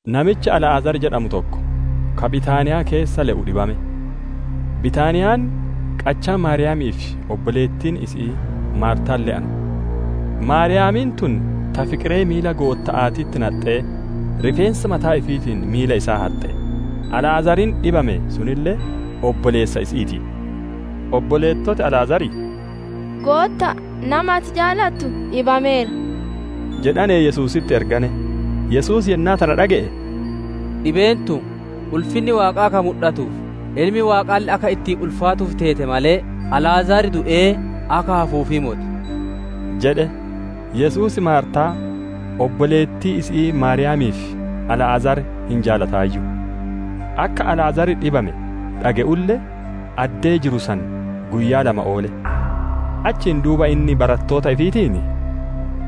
Namichi Alaazar jedhamu tokko, ka Bitaaniyaa keessa le'u dhibame. Bitaaniyaan qachaa Maariyaamii fi obboleettiin isi'ii Maartaan le'anu. Maariyaamiin tun ta fiqiree miila Gootta'aatitti naxxee, rifeensa mataa ifiitiin miila isaa haxxe; Alaazariin dhibame sunille obboleessa isi'ii ti. Obboleettoti Alaazarii: «Gootta'a, nami ati jaalattu dhibameera» jedhanee Yesuusitti ergane. Yesuus yennaa tana dhage'e, «Dhibeen tun, ulfinni Waaqaa akka mudhatuuf, Ilmi Waaqaalle akka ittiin ulfaatuuf teete malee, Alaazar du'ee akka hafuufii moti» jedhe. Yesuus Maartaa, obboleettii isi'ii Maariyaamii fi Alaazar hin jaalataayyu. Akka Alaazar dhibame dhage'ulle, addee jiru san guyyaa lama oole. Achiin duuba inni barattoota ifiitiin,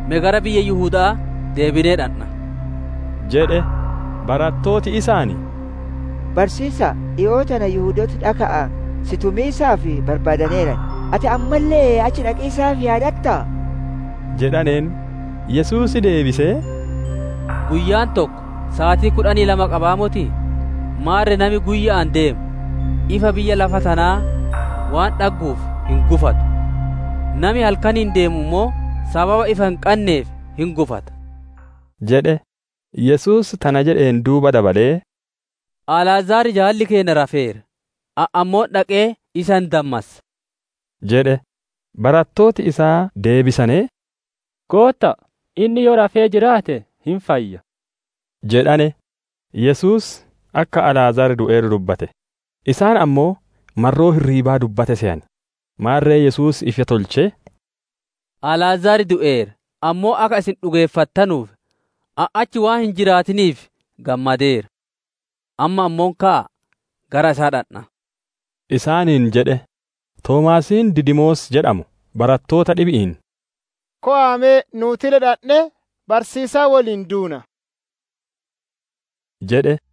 «Me gara biyya Yihuda'aa deebinee dhandha» jedhe. Barattooti isaan, «Barsiisa'a, dhikoo tana Yihudooti dhaka'aan si tumiisaaf barbaadaneeran; ati ammalle achi dhaqiisaaf yaadattaa?» jedhaneen. Yesuus deebisee, «Guyyaan tokko saatii kudhanii lama qabaa motii? Maarre nami guyya'aan ideemu, ifa biyya lafaa tana waan dhagguuf hin gufatu. Nami halkaniin ideeme ammoo, sababa ifa hin qanneef hin gufata» jedhe. Yesuus tana jedheen duuba dabalee, «Alaazar jaalli keenna rafeera, ani ammoo dhaqee isa hin dammassa» jedhe. Barattooti isaa deebisanee, «Gootta'a, inni yoo rafee jiraate, hin fayya» jedhane. Yesuus akka Alaazar du'eeru dubbatte; isaan ammoo marroo hirriibaa dubbate seyane. Maarre Yesuus ifa tolchee, «Alaazar du'eera; ammoo akka isin dhugeeffattanuuf, ani achi waan hin jiraatiniif gammadeera. Amma ammoo ka'aa gara isaa dhandhaa!» isaaniin jedhe. Toomaasiin Didimoos jedhamu barattoota dhibi'iin, «Kowaa me nuutille dhandhee, barsiisaa woliin duunaa!» jedhe.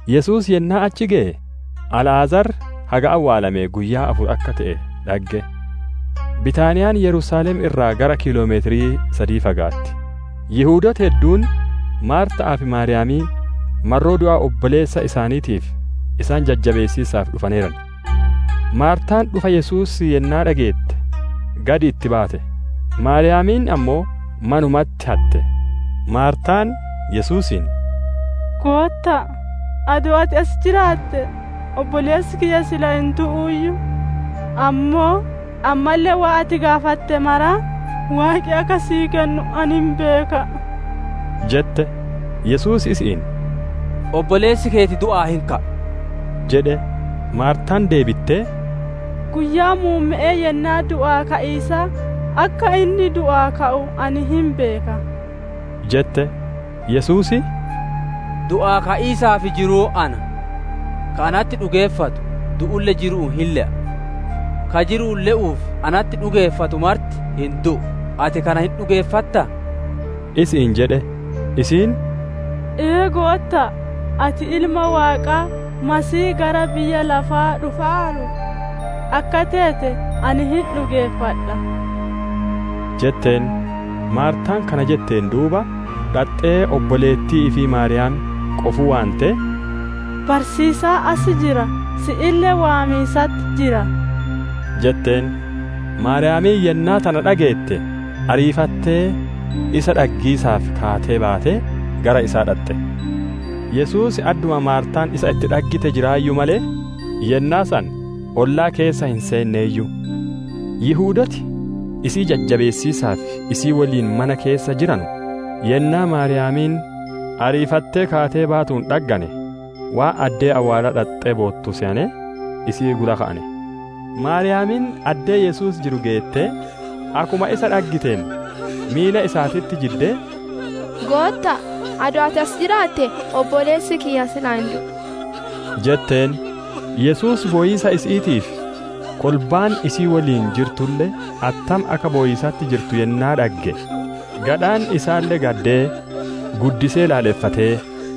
Yesuus yennaa achi geye, Alaazar haga awwaalamee guyyaa afur akka te'e dhagge. Bitaaniyaan Yerusaalem irraa gara kiiloomeetira sadii fagaatti; Yihudooti hedduun Maarta'aa fi Maariyaam marroo du'a obboleessa isaaniitiif isaan jajjabeessiisaaf dhufaneeran. Maartaan dhufa Yesuusii yennaa dhageette, gad itti baate; Maariyaam ammoo manumatti hatte. Maartaan Yesuusiin, «Gootta'a, adoo ati as jiraattee, obboleessi kiyya silaa hin du'uuyyu! Ammoo, ammalle waan ati gaafatte mara Waaqi akka sii kennu ani hin beeka» jette. Yesuus, isi'iin, «Obboleessi keeti du'aa hin ka'a» jedhe. Maartaan deebittee, «Guyyaa muumme'ee yennaa du'aa ka'iisaa, akka inni du'aa ka'u ani hin beeka» jette. Yesuus, «Du'aa ka'iisaa fi jiruun ana. Ka natti dhugeeffatu, du'ulle jiru'uun hin le'a; Ka jiru'uun le'uu fi natti dhugeeffatu marti hin du'u. Ati kana hin dhugeeffattaa?» isi'iin jedhe. Isiin, «Ee Gootta'a, ati Ilma Waaqaa, Masiihii gara biyya lafaa dhufaaru akka teete ani hin dhugeeffadha» jetteen. Maartaan kana jetteen duuba, dhaxxee obboleettii ifii Maariyaam qofuu waantee, «Barsiisaan as jira, si'ille waamiisatti jira» jetteen. Maariyaamiin yennaa tana dhageette, ariifattee isa dhaggiisaaf kaatee baatee gara isa dhaxxe. Yesuus adduma Maartaan isa itti dhaggite jiraayyu malee, yennaa san ollaa keessa hin seenneeyyu. Yihudooti isii jajjabeessiisaaf isii woliin mana keessa jiranu, yennaa Maariyaamiin ariifattee kaatee baatuun dhaggane, waan addee awwaalaa dhaxxee boottu seyanee, isii gula ka'ane. Maariyaam addee Yesuus jiru geettee, akkuma isa dhaggiteen, miila isaatitti jiddee, «Gootta'a! Adoo ati as jiraattee, obboleessi kiyya silaa hin du'u» jetteen. Yesuus bowiisa isi'iitii fi kolbaan isii woliin jirtulle attam akka bowiisatti jirtu yennaa dhagge, gadhaan isaalle gaddee, guddisee laaleffatee,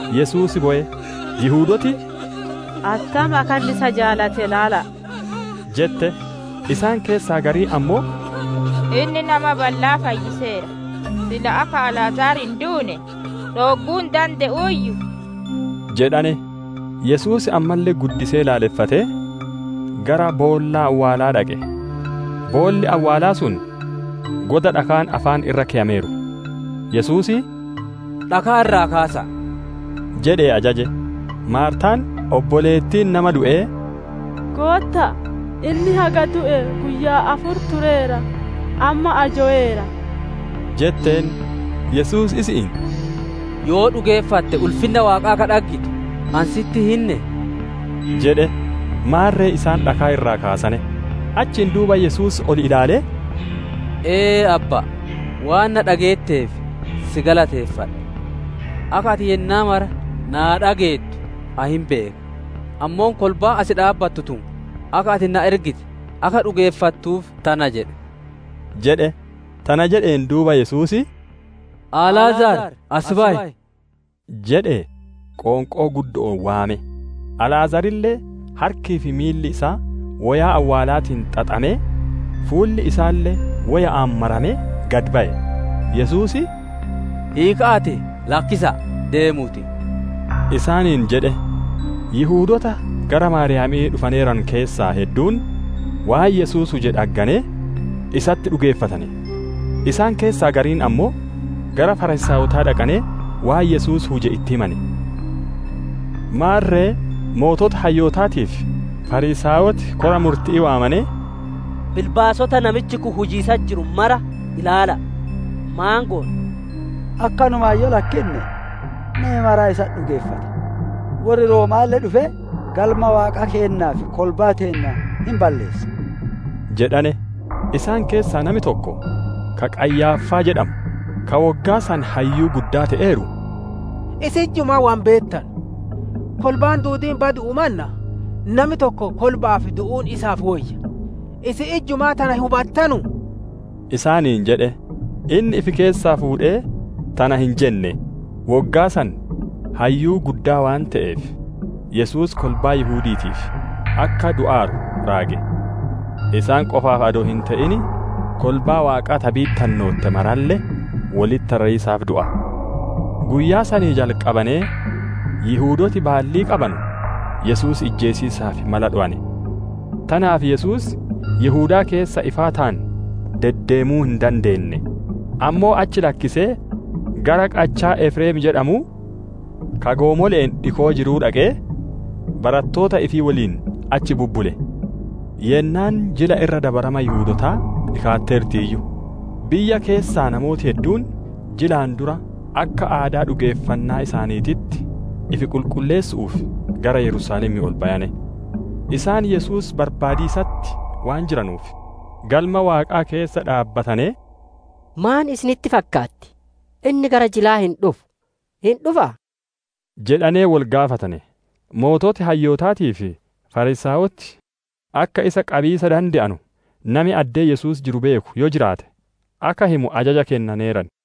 Yesuus bowe. Yihudooti, «Attam akka inni isa jaalate ilaala'a!» jette. Isaan keessaa gariin ammoo, «Inni nama ballaa fayyiseera, silaa akka Alaazar hin duune dhoogguu hin dande'uuyyuu?» jedhane. Yesuus ammalle guddisee laaleffatee, gara boolla awwaalaa dhaqe. Boolli awwaalaa sun goda dhakaan afaan irra keyameeru. Yesuus, «Dhakaa irraa kaasa'a!» jedhee ajaje. Maartaan, obboleettiin nama du'ee, «Gootta'a, inni haga du'ee guyyaa afur tureera. Amma ajoweera!» jetteen. Yesuus isi'iin, «Yoo dhugeeffatte ulfinna Waaqaa akka dhaggitu, ani sitti hin hinnee?» jedhe. Maarre isaan dhakaa irraa kaasane. Achiin duuba Yesuus ol ilaalee, «Ee Abba'a, waan na dhageetteef, si galateeffadha. Akka ati yennaa mara naa dhageettu ani hin beeka; ammoo kolbaan as dhaabbattu tun akka ati ana ergite akka dhugeeffattuuf tana jedhe» jedhe. Tana jedheen duuba, Yesuus, «Alaazar, as bayi!» jedhee qoonqoo guddo'oon waame. Alaazarille harkii fi miilli isaa woyaa awwaalaatiin xaxamee, fuulli isaalle woya'aan maramee, gad baye. Yesuus, «Hiika'aatii lakkisa'a, deemuutii» isaaniin jedhe. Yihudoota gara Maariyaamii dhufaneeranu keessaa hedduun waan Yesuus huje dhagganee, isatti dhugeeffatane. Isaan keessaa gariin ammoo gara Fariisaayotaa dhaqanee waan Yesuus huje itti himane. Maarre sooreyyiin hayyootaatii fi Fariisaayoti kora murti'ii waamanee, «Bilbaasota namichi kun hujiisatti jiru mara ilaala'a! Maan goona? Akkanumaan yoo isa lakkinne, nami maraa isatti hin dhugeeffata; worri Rooma'aalle dhufee Galma Waaqaa keennaa fi kolbaa teenna hin balleessa» jedhane. Isaan keessaa nami tokko, ka Qayyaaffaa jedhamu, ka woggaa san hayyuu guddaa te'eeru, «Isin ijjumaa wo hin beettanu; kolbaan duudiin badu'uu mannaa, nami tokko kolba'aaf du'uun isiniif woyya; isin ijjumaa tana hin hubattanuu?» isaaniin jedhe. Inni ifi keessaa fuudhee tana hin jenne; woggaa san hayyuu guddaa waan te'eef, Yesuus kolbaa Yihudi'iitiif akka du'aaru raage. Isaan qofaaf adoo hin te'in, kolbaa Waaqaa ta bittinnootte maralle wolitti rariisaaf du'a. Guyyaa sanii jalqabanee Yihudooti baallii qabanu Yesuus ijjeesiisaaf mala dhowane. Tanaaf Yesuus Yihudaa keessa ifaataan deddeemuu hin dandeenne; ammoo achi lakkisee gara qachaa Efreem jedhamuu, ka goomole'een dhikoo jiruu dhaqee, barattoota ifii woliin achi bubbule. Yennaan Jila Irra Dabarama Yihudootaa dhikaatteertiiyyu; biyya keessaa namooti hedduun jilaan dura akka aadaa dhugeeffannaa isaaniititti ifi qulqulleessu'uuf gara Yerusaalemii ol bayane. Isaan Yesuus barbaadiisatti waan jiranuuf, Galma Waaqaa keessa dhaabbatanee, «Maan isinitti fakkaatti? Inni gara jilaa hin dhufu, hin dhufaa?» jedhanee wol gaafatane. Sooreyyiin hayyootaatii fi Fariisaayoti akka isa qabiisa dande'anu, nami addee Yesuus jiru beeku yoo jiraate, akka himu ajaja kennaneeran.